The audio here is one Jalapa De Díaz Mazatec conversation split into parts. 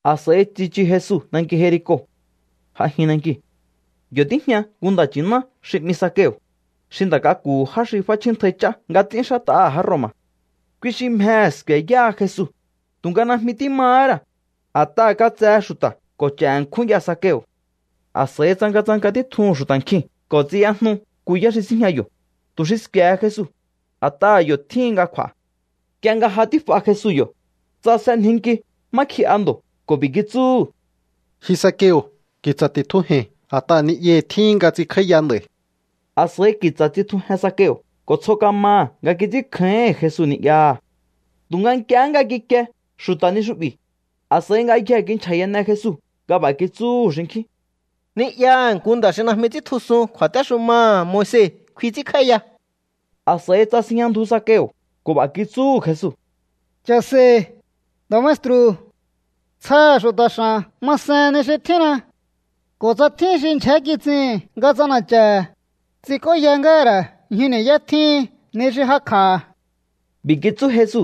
A̱s'a̱i tsichu Jesu nanki Jerico. J'ajin nankiu̱. Yo̱ tíjña nku nda̱ nchi̱ná xi 'mi Zakeo̱, xi nda̱ k'aku̱hu̱ já xi f'áchjíntjai ch'á nga ts'ínxát'aha̱ já Roma̱. Kui xi mjehe̱ sku̱e̱ yáha Jesu, tu̱nga najmi tímahá ra̱, a̱t'aha̱ katsehe xu̱ta̱ ko̱ ch'e̱ ṉkjún ya Zakeo̱. A̱s'a̱i tsangatsanka títjuhu̱n xu̱ta̱ nkjiu̱n ko̱ tsiyajnu nku yá xi síjña yo̱, tu̱ xi sku̱e̱he Jesu, a̱t'aha̱ yo̱ tjíhin nga kj'u̱a̱. Nk'ie nga ja tíf'a Jesu yo̱, tsasenjinki má kji'a ndo̱ ko̱ b'i̱ kitsúhu̱: —Ji Zakeo̱, ki̱tsa̱ ti̱tjuje̱i̱n, a̱t'aha̱ ni'yahi̱ tjíhin nga ts'inkj'áíya nd'a̱i̱. A̱s'a̱i ki̱tsa̱ tsitjujen Zakeo̱ ko̱ tsjo kamaha̱ nga kits'ínkjáíhi̱n Jesu ni'yaha̱. Tu̱nga nk'ie nga kikie xu̱ta̱ ni xu'bi̱, a̱s'a̱i ngayjee̱ kinchja̱yane Jesu nga b'a̱ kitsúhu̱ xinkjín: —Ni'yaha̱ nku nda̱ xi najmi ts'íntjusun kju̱a̱téxumaha̱ Moise kfi ts'ínkj'áíya. A̱s'a̱i tsasinjña ndju Zakeo̱ ko̱ b'a̱ kitsúhu̱ Jesu: —Cha̱se̱i̱, nda̱ maestru̱. Tsjaha̱ xu̱ta̱ x'a̱n masen ni xi tjínna. Ko̱ tsa tjín xi ndyjé kits'ihi̱n nga ts'ana̱cha̱ha̱, ts'ink'óya ngáha̱ ra̱ ñju ni̱yá tjíhin ni xi jakj'aha̱. B'i̱ kitsú Jesu: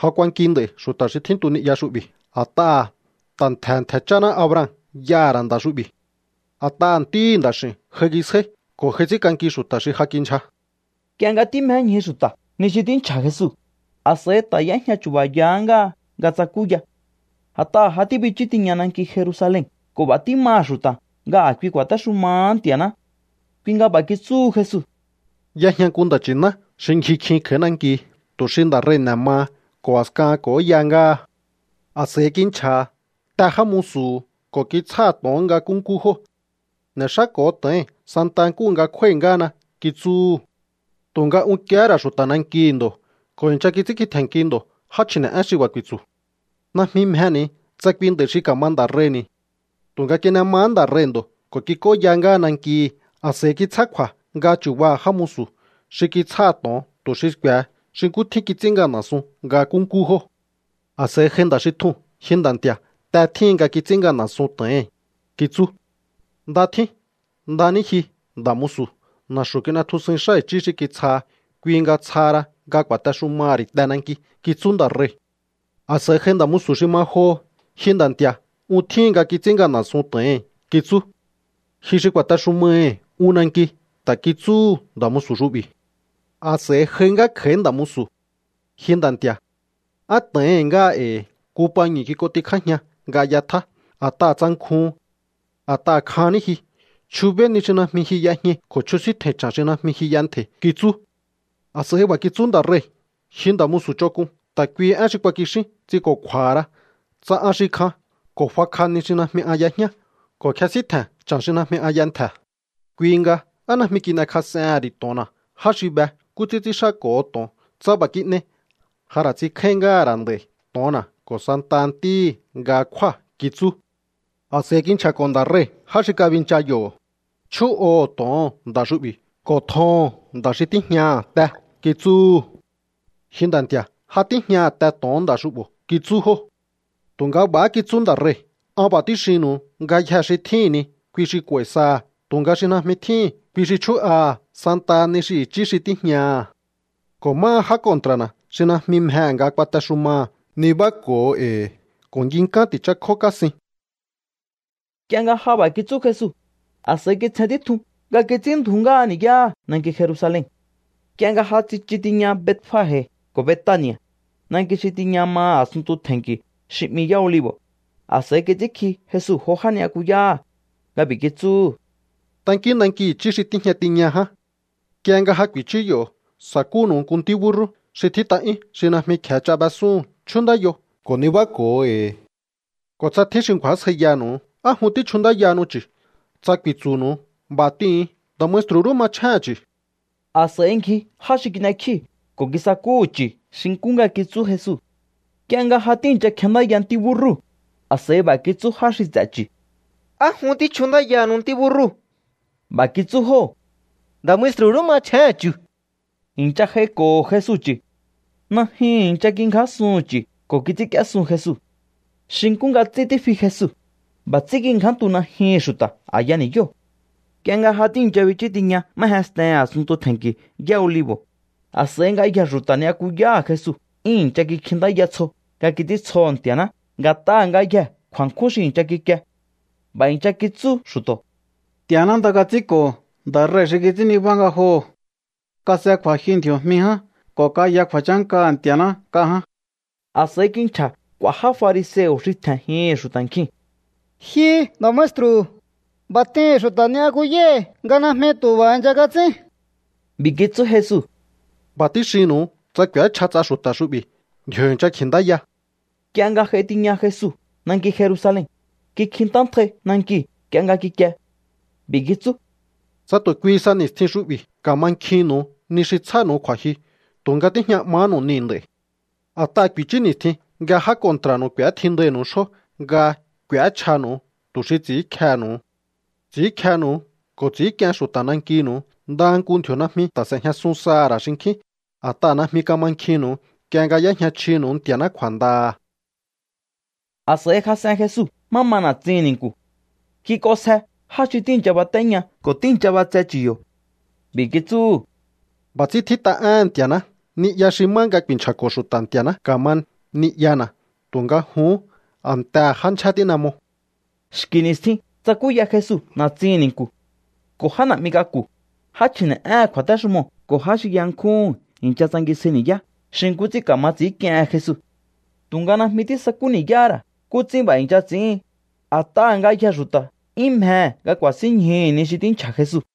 —Ja k'uanki nd'a̱i̱ xu̱ta̱ xi tjíntu ni'ya xu'bi̱, a̱t'aha̱ ta̱ ntje̱he̱ ntje̱ chjáná Abraham y'aha̱ ra̱ nda̱ xu'bi̱. A̱t'aha̱ Ntíhi̱ Nda̱x'i̱u̱n j'aingisjáí ko̱ j'ai ts'ínk'anki xu̱ta̱ xi ja kindyja. Nk'ie nga tímjéñju xu̱ta̱ ni xi tínchja̱ Jesu, a̱s'a̱i ta̱ y'éjña chu̱ba̱ya ngáha nga tsakúya. A̱t'aha̱ ja tíbichú tiña nanki Jerusalen ko̱ b'a̱ tímaha̱ xu̱ta̱ nga a̱kui ku̱a̱téxumahá Nti̱a̱ná. Kui nga b'a̱ kitsúhu Jesu: —Y'ejña nku nda̱ nchi̱ná xi ngji kjin kj'a̱í nanki tu̱ xi nda̱ rei̱ n'e̱ maha ko̱ a̱skahan k'o̱óya ngáha. A̱s'a̱i kinchja̱ha̱ te já musu̱hu̱ ko̱ kitsjáha̱ to̱on nga nkúnkú jóo̱. “N'e̱xáko̱o to̱oi̱n santa nkúhu nga kjúái̱ ngáhana”, kitsúhu̱. ’Tu̱nga unkiehé ra̱ xu̱ta̱ nankihi̱ ndo̱ ko̱ i̱ncha kits'ínkji tje̱nnki ndo̱ já chji̱ne̱'én xi b'a̱ ku̱i̱tsu̱: “Najmi mjeni̱ tsa kui nda̱i̱ xi ka̱ma nda̱ rei̱ni̱.” Tu̱nga kin'e mahá nda̱ rei̱ ndo̱ ko̱ kik'óya ngáha nankihi̱. A̱s'a̱i kitsjá kju̱a̱ nga chu̱baha̱ já musu̱ xi kitsjáha̱ to̱on, tu̱ xi sku̱e̱he xi nkú tjín kits'ín ngana̱sun nga nkúnkú jóo̱. ’A̱s'a̱i j'ai nda̱ xi tjuu̱n. “Ji nda̱ nti̱a̱, te tjíhin nga kits'ín ngana̱sun to̱ohi̱n”, kitsú. “Nda tjín. Nda ní ji, nda̱ musu̱. Na̱xu̱ kin'etjusuin xá i̱chí xi kitsjaha, kui nga tsjaha ra nga ku̱a̱texumaha̱ ri̱ te nanki”, kitsú nda̱ rei̱. A̱s'a̱i j'ai nda̱ musu̱ xi ma joho. “Ji nda̱ nti̱a̱, un tjíhin nga kits'ín ngana̱sun to̱ohi̱n”, kitsú. “Ji xi ku̱a̱texumaihi̱ un nanki”, ta̱ kitsúhu̱ nda̱ musu̱ xu'bi̱. ’A̱s'a̱i j'ai ngá kj'a̱í nda̱ musu̱. “Ji nda̱ nti̱a̱, á to̱ohi̱n ngáha e̱i̱. Nku pañu̱ kik'ontikjájian nga y'etjá, a̱t'aha̱ tsankjuhun. A̱t'aha̱ kjan ní ji. Chjubéí ni xi najmi ji y'ejñai ko̱ chjusíntje̱i̱n cha̱n xi najmi ji y'entje̱i̱”, kitsú. A̱s'a̱i b'a̱ kitsú nda̱ rei̱: “Ji nda̱ musu̱ ch'onk'un, ta̱ kuihi én xi kuakixín ts'inko̱kju̱a̱hara. Tsa an xi kjan ko̱ fakj'a ni xi najmi an y'ejñá ko̱ kjesíntje̱n cha̱n xi najmi an y'entje̱, kui nga, ¿á najmi kin'ekjas'ehe̱n ri̱ to̱onna̱ já xi be nkú ts'ín ts'ínxáko̱ho to̱on? Tsa b'a̱ kin'ei, ja ra̱ ts'inkjáín ngáha̱ ra̱ nd'a̱i̱ to̱onna̱ ko̱ santaha ntíhi̱ nga kjúa̱”, kitsú. ’A̱s'a̱i kinchja̱ko̱ nda̱ rei̱ já xi kabincha yo̱. “Chjú'oho̱o to̱oo̱n nda̱ xu'bi̱ ko̱ tjoho̱on nda̱ xi tíjñaha̱ te”, kitsúhu̱. “Ji nda̱ nti̱a̱, ja tíjñaha̱ te to̱on nda̱ xu'bo̱”, kitsú jóo̱. Tu̱nga b'a̱há kitsú nda̱ rei̱: “An b'a̱ tíxinnu̱u. Ngayjee̱ xi tjíhi̱n ni, kui xi k'u̱a̱i̱ saha̱. Tu̱nga xi najmi tjíhi̱n, kui xi chjú'aha̱ santaha ni xi i̱chí xi tíjñaha̱. Ko̱ máha já kontra̱na̱ xi najmi mjehe̱ nga kuatexumaha̱, nibáko̱o e̱i̱ ko̱ nginkán ti̱chákjó kásin.” Nk'ie nga ja b'a̱ kitsú Jesu, a̱s'a̱i kitsjen títjun nga kits'ínndju̱ú ngáha ni̱yáha̱ nanki Jerusalen. Nk'ie nga ja tsichu tiña Betfage ko̱ Betani̱a̱, nanki xi tiña maha̱ a̱sunntu tje̱nki̱ xi 'mi Yá Olivo̱, a̱s'a̱i kits'ínkji Jesu jo já ni'yakuyáha̱ nga b'i̱ kitsúhu̱: —Tankíún nanki i̱chí xi tíjña tiña ján. Nk'ie nga ja ku̱i̱chú yo̱, sa̱kúnu̱u nku ntí búrrú xi tjít'a'yún, xi najmi kje̱e ch'a b'esúhu̱n. Chjúnndáyo ko̱ nibáko̱o e̱i̱. Ko̱ tsa tjín xi ngju̱ásjaiyanu̱u: “¿Á jun tíchjundáyahanu chu̱?”, tsa ku̱i̱tsu̱nu̱u, b'a̱ t'ihu̱un: “Nda̱ maestru̱ rú machjéhe̱n chu̱.” A̱s'a̱i ngji já xi kin'ekjíu̱ ko̱ kisakúhu̱ chu̱ xi nkú nga kitsú Jesu. Nk'ie nga ja tíi̱ncha kjendáya ntí búrrúu̱, a̱s'a̱i b'a̱ kitsú já xi ts'e̱ chu̱: —¿Á jun tíchjundáyahanu ntí búrrúu̱? B'a̱ kitsú jóo̱: —Nda̱ maestru̱ rú machjéhe̱n chu̱. I̱ncha j'aiko̱ho̱ Jesu chu̱. Najyuhu̱n i̱ncha kingjásuhu̱n chu̱ ko̱ kits'ínk'íésun Jesu. Xi nkú nga ts'ín tífi Jesu, b'a̱ ts'ín kingjántu najyuhu̱n xu̱ta̱ a̱ya ni̱yóo̱. Nk'ie nga ja tíi̱ncha bichú tiña má jenstehe̱n a̱sunntu tje̱nki̱ Yá Olivo̱, a̱s'a̱i ngayjee̱ xu̱ta̱ ni'yakuyáha̱ Jesu 'yún i̱ncha kikjintáya tsjo nga kits'íntsjoho̱ Nti̱a̱ná nga̱t'aha̱ ngayjee̱ kju̱a̱nkjún xi i̱ncha kikie. B'a̱ i̱ncha kitsú xu̱to̱: —¡Nti̱a̱ná nda kats'ínko̱ nda̱ rei̱ xi kits'ín nibá ngajoho̱! ¡Kas'e kju̱a̱jyu ndji̱o̱jmi ján ko̱ kaya kju̱a̱chánkaha̱ Nti̱a̱ná nk'a ján! A̱s'a̱i kinchja̱ k'u̱a̱ já fariseo̱ xi tje̱njihi̱n xu̱ta̱ nkjiu̱n: —Ji nda̱ maestru̱, b'a̱ t'ihi̱n xu̱ta̱ ni'yakuyáhi̱ nga najmi tu̱ b'a̱ i̱ncha kats'ín. B'i̱ kitsú Jesu: —B'a̱ tíxinnu̱u, tsa k'u̱échja ts'a xu̱ta̱ xu'bi̱, ndji̱o̱ i̱ncha kji̱ntáya. Nk'ie nga j'ai tiña Jesu nanki Jerusalen, kikjintántjai nankiu̱ nk'ie nga kikie. B'i̱ kitsú: —¡Tsa tu̱ kui sa ni̱stjin xu'bi̱ ka̱mankjinnu̱u ni xi tsjánu̱u kju̱a̱jyu! Tu̱nga tíjña 'mahánu̱u niu̱ nd'a̱i̱. A̱t'aha̱ ku̱i̱chú ni̱stjin nga já kontra̱nu̱u k'u̱étjindainu̱u xjó nga k'u̱échjanu̱u tu̱ xi ts'i̱ínkjehe̱nu̱u. Ts'i̱ínkjenu̱u ko̱ ts'i̱ínk'ien xu̱ta̱ nankinu̱u. Ndaha nku ndji̱o̱ najmi ta̱ s'e̱jñasun saha̱ ra̱ xinkjín. A̱t'aha̱ najmi kamankjinnu̱u nk'ie nga y'éjña chjinu̱u Nti̱a̱ná kju̱a̱ndaha̱. A̱s'a̱i jas'en Jesu má ma na̱tsihi̱n ni̱nku̱. Kik'onsje já xi tíi̱ncha batéña ko̱ tíi̱ncha b'atse chu̱ yo̱. B'i̱ kitsúhu̱: —B'a̱ ts'ín tjít'a éhe̱n Nti̱a̱ná: “Ni'ya xi má nga ku̱i̱nchja̱ko̱ xu̱ta̱ Nti̱a̱ná ka̱ma ni'yana̱.” Tu̱nga jun a̱ntehe̱ já ndyjé tín'e mo. Xki̱ ni̱stjin tsakúya Jesu na̱tsihi̱n ni̱nku̱. Ko̱ já na̱'mi k'aku̱, já chji̱ne̱'éhe̱n kju̱a̱téxumoo̱ ko̱ já xi yankjúhu̱n i̱ncha tsangisjai ni̱yá xi nkú ts'ín ka̱ma ts'i̱ínk'iehen Jesu. Tu̱nga najmi tísakú ni̱yáhá ra̱ nkú ts'ín b'a̱ i̱ncha ts'i̱ín, a̱t'aha̱ ngayjee̱ xu̱ta̱ 'yún mjehe̱ nga ku̱a̱sínñjuhu̱ ni xi tínchja̱ Jesu.